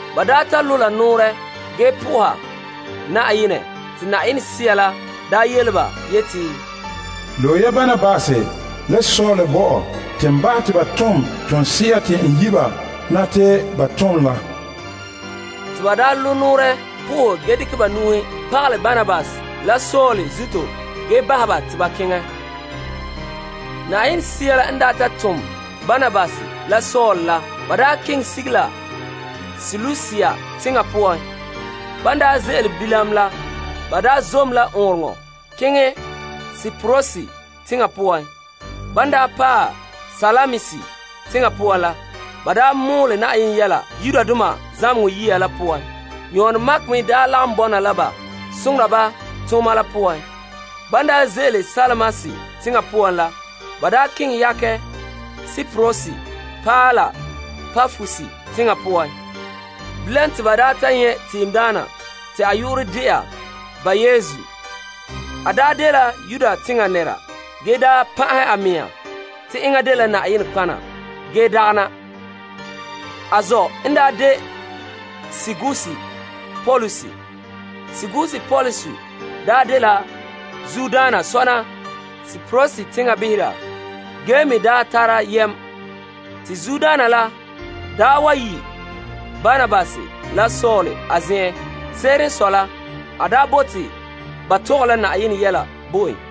Ba daa ta zagahɛ ba mɛhe ge na'aha Na'ayenɛ te Yenɛ Sea la yele ba yeti, Loe ya Barnabas la Saul bo mam te n bahɛ ba te ba tom toonse'a te n yi' ba na te ba tom la. Te ban zagahɛ ba mɛhe po'ohɛ ge dekɛ ba nu'uhen pagalɛ Barnabas la Saul zuto, ba bahɛ ba te ba keŋɛ. Yenɛ Sea la tom Barnabas la Saul la te ba keŋɛ sige la Seleusia teŋa poan. Ban ze'ele bilam la, ba zom la ɔɔnrɔŋɔ kantɛ keŋɛ Kiprus teŋa poan. Ban paɛ Salamis teŋa poan la, ba mɔɔlɛ Yenɛ yɛla Yudoma zamehegɔ yire la poan. Yon Mark me lagom bɔna la ba soŋora ba tooma la poan. Ban ze'ele Salamis teŋa poan la, ba keŋɛ yakɛ Kiprus paɛ la Papos teŋa poan. Bilam te ba nyɛ' tiimdaana te a yu'urɛ de'a Bar Yesu. A dela Yuda teŋa nɛra ge daa pan'ahɛ a mea te enŋa dela Yenɛ nɔtɔgɔha ge dagana. A zɔ' n de Sergius Paulus. Sergius Paulus dela zuodaana sɔna Kiprus teŋa behera ge me daa tara yam. Te zuodaana la yi' Barnabas la Saul a zen'en. Se'ere n sɔe la, a bote ba tɔgɛ la Yenɛ yɛla bo en.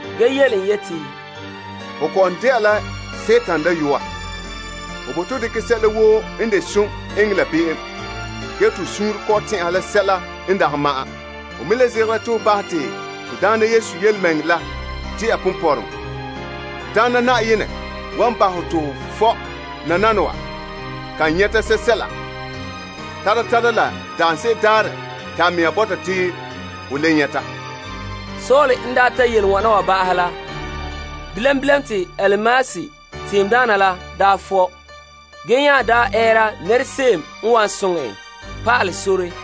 ge yele en yeti, Ho kɔ'ɔn de'a la Sagona dayɔa. Ho bote ho dekɛ sɛla woo n de som eŋɛ la be'em ge te ho suunre kɔ'ɔn tɛn'ɛha la sɛla n dagɛ ma'an. Ho me le zegera te ho bahɛ te to Daana Yesu yelemɛŋɛrɛ la de'a ponpɔrɔŋɔ. Te Na'ayenɛ wan bahɛ hɔ te ho fɔ' nananawa kan nyɛta sɛla tara, tara la daanse'ere daarɛ te a mea bɔta te ho le nyɛta. Paul n ta yele n wana ba'ahɛ la, bilam bilam te tiimdaana Elimas la fɔ' ge nya ɛɛra nɛrese'em n wan soŋɛ en pa'alɛ sore.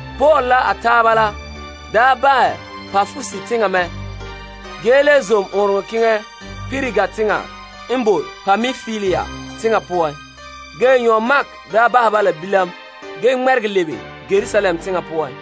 Paul la a taaba la bahɛ Papos teŋa mɛ ge le zom ɔɔnrɔŋɔ kantɛ keŋɛ Perga teŋa n boe Pampilia teŋa poan. Ge Yon Mark bahɛ ba la bilam ge ŋmɛregɛ lebe Yerusalem teŋa poan.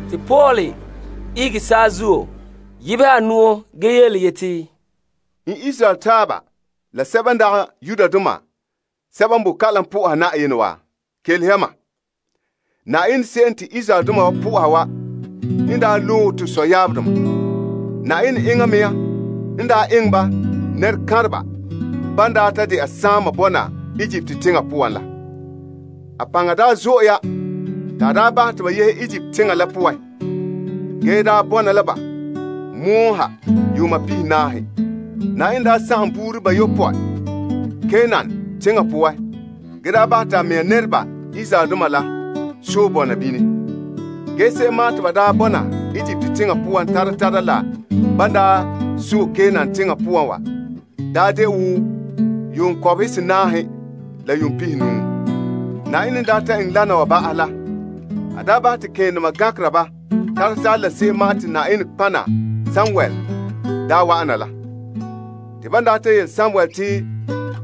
Te Paul ihege saazuo yebehɛ a nu'o ge yeti, N Israel taaba la sɛba n dagɛ Yudoma sɛba n boe kalam po'oha Yenɛ wa, kelehe ya mam. Yenɛ se'em te Israeldoma wa po'oha wa n daa loe to sɔyaabdoma. Yenɛ enŋa mea n daa eŋɛ ba teŋkantɛ daa ta de'a saama bɔna Egipt teŋa poan la. A paŋa daa zo'e ya te a daa bahɛ te ba yehe Egipt teŋa la poan ge daa ŋmibe la ba pɔgɔtia la ha yuun pihinaahe. Yenɛ daa sagom buuri bayopɔe Kanaan teŋa poan ge da bahɛ to a mea nɛreba Israeldoma la sɔe bɔna bini. Ge se'em ma'an te ba daa bɔna Egipt teŋa poan tara tara la ban daa sɔe Kanaan teŋa poan wa daa de wo yuun kɔbehe senaahe la yuun pihinuu. Yenɛ n daa ta eŋɛ wana wa ba'ahɛ la, a daa bahɛ te kema gankera ba tara tara la se'em ma'an te Yenɛ nɔtɔgɔha Samuel daa wa'an na la. Te ban daa ta yele Samuel te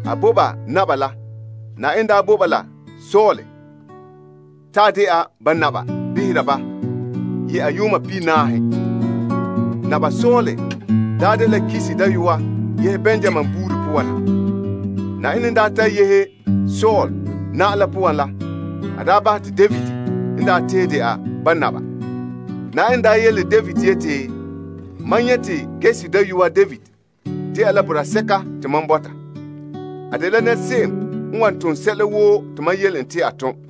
a bo ba Naba la, Yenɛ daa bo ba Saul ta de'a ba Naba behera ba ye'a yuun pihinaahe. Naba Saul daa dela Kis dayɔa yehe Benyamin buuri poan na. Yenɛ n daa ta yehe Saul na'am la poan la, a daa bahɛ te David n daa tee de'a ba naba. Na'ayenɛ daa yele David yeti, Mam nyɛ' te Yesse dayɔa David de'a boraa sɛka n tare Na'ayenɛ mɛŋa suunre. A dela nɛrese'em n wan tom sɛla woo te mam yele en te a tom.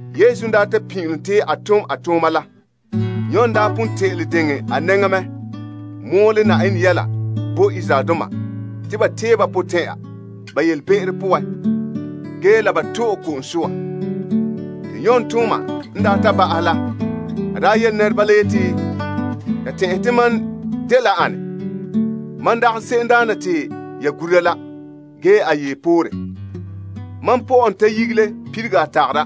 Yesu n daa ta pin'ilom te a tom a tooma la, Yon daa pon te'ele diŋɛ a nɛŋa mɔɔlɛ Yenɛ yɛla bo Israeldoma te ba tee ba potɛn'ɛra ba yelebe'ero poan ge la ba to'e ko'om soa. Te Yon tooma n daa ta ba'aha la, a daa yele nɛreba la yeti, Ya tɛn'ɛhe te mam dela ane? Ma dagɛ se'emdaana te ya gura la. Ge a yee poore. Ge mam pɔ'ɛ n ta nyigele perege a tagara.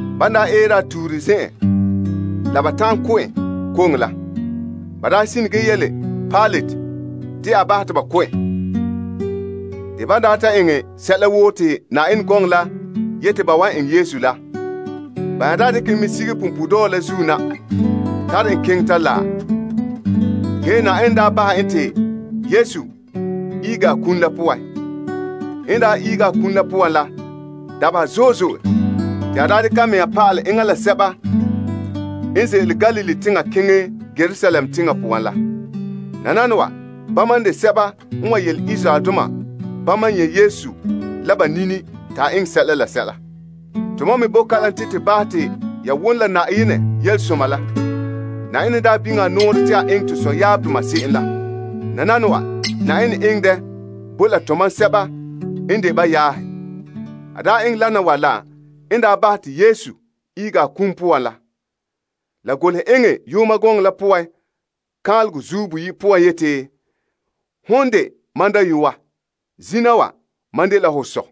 Ban daa eere a tuure zen'an la la ba ta'an ko' en koŋe la, ba daa sine ge yele Pilate te a bahɛ te ba ko' en. Te ban daa ta eŋɛ sɛla woo te Yenɛ gɔŋɔ la yete ba wan eŋɛ Yesu la, ba nya daa dekɛ en mɛ sige punpuuredɔɔ la zuo na tare en keŋɛ ta laɛ. Ge Yenɛ daa bahɛ en te Yesu ihege a kum la poan. N daa ihege a kum la poan la, dabeha zo'e zo'e te a daa dekɛ a mea pa'alɛ enŋa la sɛba daa ne ze'ele Galilee teŋa keŋɛ Yerusalem teŋa poan la. Nananawa bama n de a seradoma n wan yele Israeldoma bama n nyɛ' Yesu la ba nini te a eŋɛ la sɛla. Tomam me bo kalam te to bahɛ te ya wom la Yenɛ Yelesoma la. Yenɛ n daa biŋe a nɔɔrɛ te a eŋɛ to sɔyaabdoma se'em la. Nananawa Yenɛ eŋɛ dɛ bo la tomam sɛba n de ba yaahe. A daa eŋɛ lana wa la n daa bahɛ te Yesu ihege a kum poan la. La golehɛ eŋɛ yooma gɔŋɔ la poan kaanlegɔ boyi' poan yeti te, Zina wa, Ho dela mam dayɔa te mam me dɛna ho sɔ.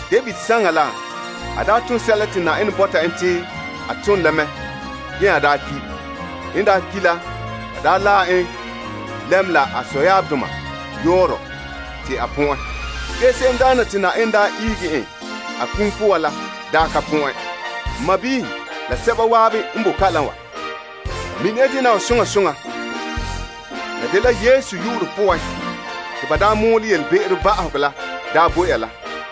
David saŋa la a daa ton sɛla te Yenɛ bɔta en te a ton la mɛ ge nya daa ki'. N daa ki' la, ba daa laɛ n lɛm la a sɔdoma yɔɔrɔ te a pɔ'ɛn. Ge se'emdaana te Yenɛ daa ihege en a kum poan la daa ka pɔ'ɛn. N sɔɔnrɔ la sɛba zan'an n bo kalam wa, mine ya dena wa. La dela Yesu yu'urɛ poan te ba daa mɔɔlɛ yelebe'ero bahega la daa bo ya la.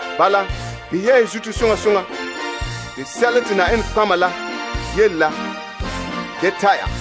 Bala, behɛ ya ya zuto soŋa soŋa te sɛla te nɔtɔgɔheba la yele la da ta' ya.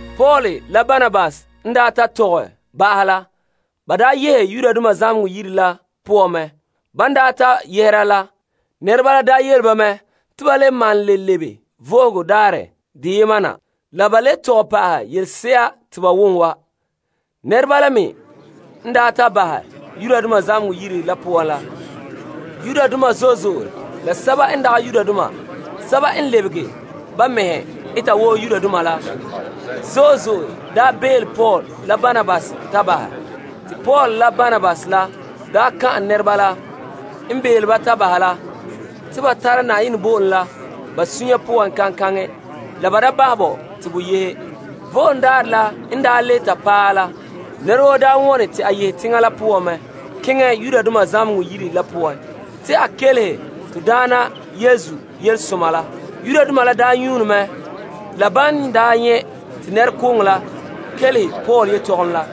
Paul la Barnabas n ta tɔgɛ ba'ahɛ la, ba yehe zamehegɔ yire la poan mɛ. Ban ta yɛhera la, nɛreba la yele ba mɛ te ba le malom le lebe Vo'ohogo Daarɛ la deyema na la ba le tɔgɛ pa'ahɛ yelese'a te ba wom wa. Nɛreba la me n ta bahɛ zamehegɔ yire la poan la, Yudoma la sɛba n lebege ba mɛhe eta wo Yudoma la zo'e zo'e belom Paul la Barnabas ta bahɛ. Te Paul la Barnabas kan'an ba te ba bɔna Yenɛ zo'ohogɔ la poan. Vo'ohogo Daarɛ la n le ta paɛ la, nɛra woo wone te a yehe teŋa la poan mɛ keŋɛ zamehegɔ yire la poan te a kelehe to Daana Yesu Yelesoma la. Yudoma la nyuune mɛ zo'e zo'e la ban nyɛ' te nɛrekooŋɔ la kelehe Paul yetɔgom la.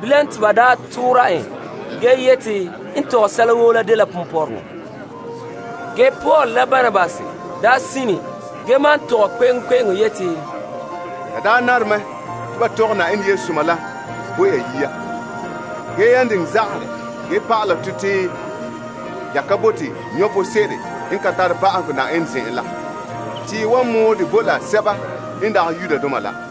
Bilam te ba toora en ge yete n tɔgɛ sɛla woo la dela ponpɔrɔŋɔ. Ge Paul la Barnabas sine ge maan tɔgɛ kpe'eŋkpe'eŋo yeti, La daa nare mɛ te ba tɔgɛ Yenɛ Yelesoma la bo ya yia. Ge yan diŋɛ zagahɛ dɛ ge pa'ala tɔ te ya ka bote vom sebo n ka tare ba'ahegɔ Yenɛ zen'en la, te ye wan mɔɔlɛ dɛ bo la sɛba n dagɛ Yudoma la.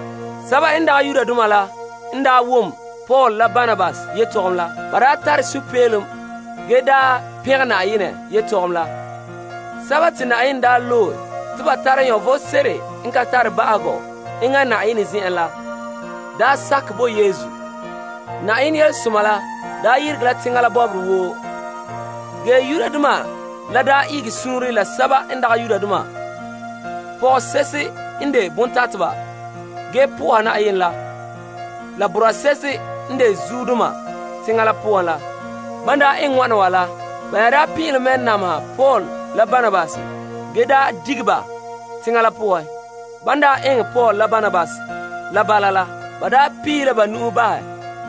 Sɛba n dagɛ Yudoma la n wom Paul la Barnabas yetɔgom la, ba tare sunpeelom ge pɛngɛ Na'ayenɛ yetɔgom la. Sɛba te Na'ayenɛ loe te ba tara vom sebo n ka tare ba'ahegɔ enŋa Na'ayenɛ zen'en la sakɛ bo Yesu. Na'ayenɛ Yelesoma la yeregɛ la teŋa la bɔbɔre woo. Ge Yudoma la tugulɛ la pɔgɔse'ehe n de bontateba ge po'oha Yenɛ la la boraa se'ehe n de zuodoma teŋa la poan la. Ban eŋɛ wana wa la, ba nya pin'ilom mɛ nameha Paul la Barnabas ge dige ba teŋa la poan. Ban eŋɛ Paul la Barnabas la bala la, ba piihe ba na'ma puuhugo bahɛ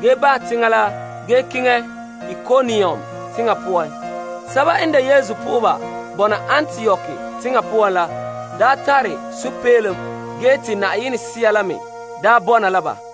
ge bahɛ teŋa la ge keŋɛ Ikonium teŋa poan. Sɛba n de Yesu po'oheba bɔna Antiok teŋa poan la daa tare sunpeelom ge te Yenɛ Sea la me bɔna la ba.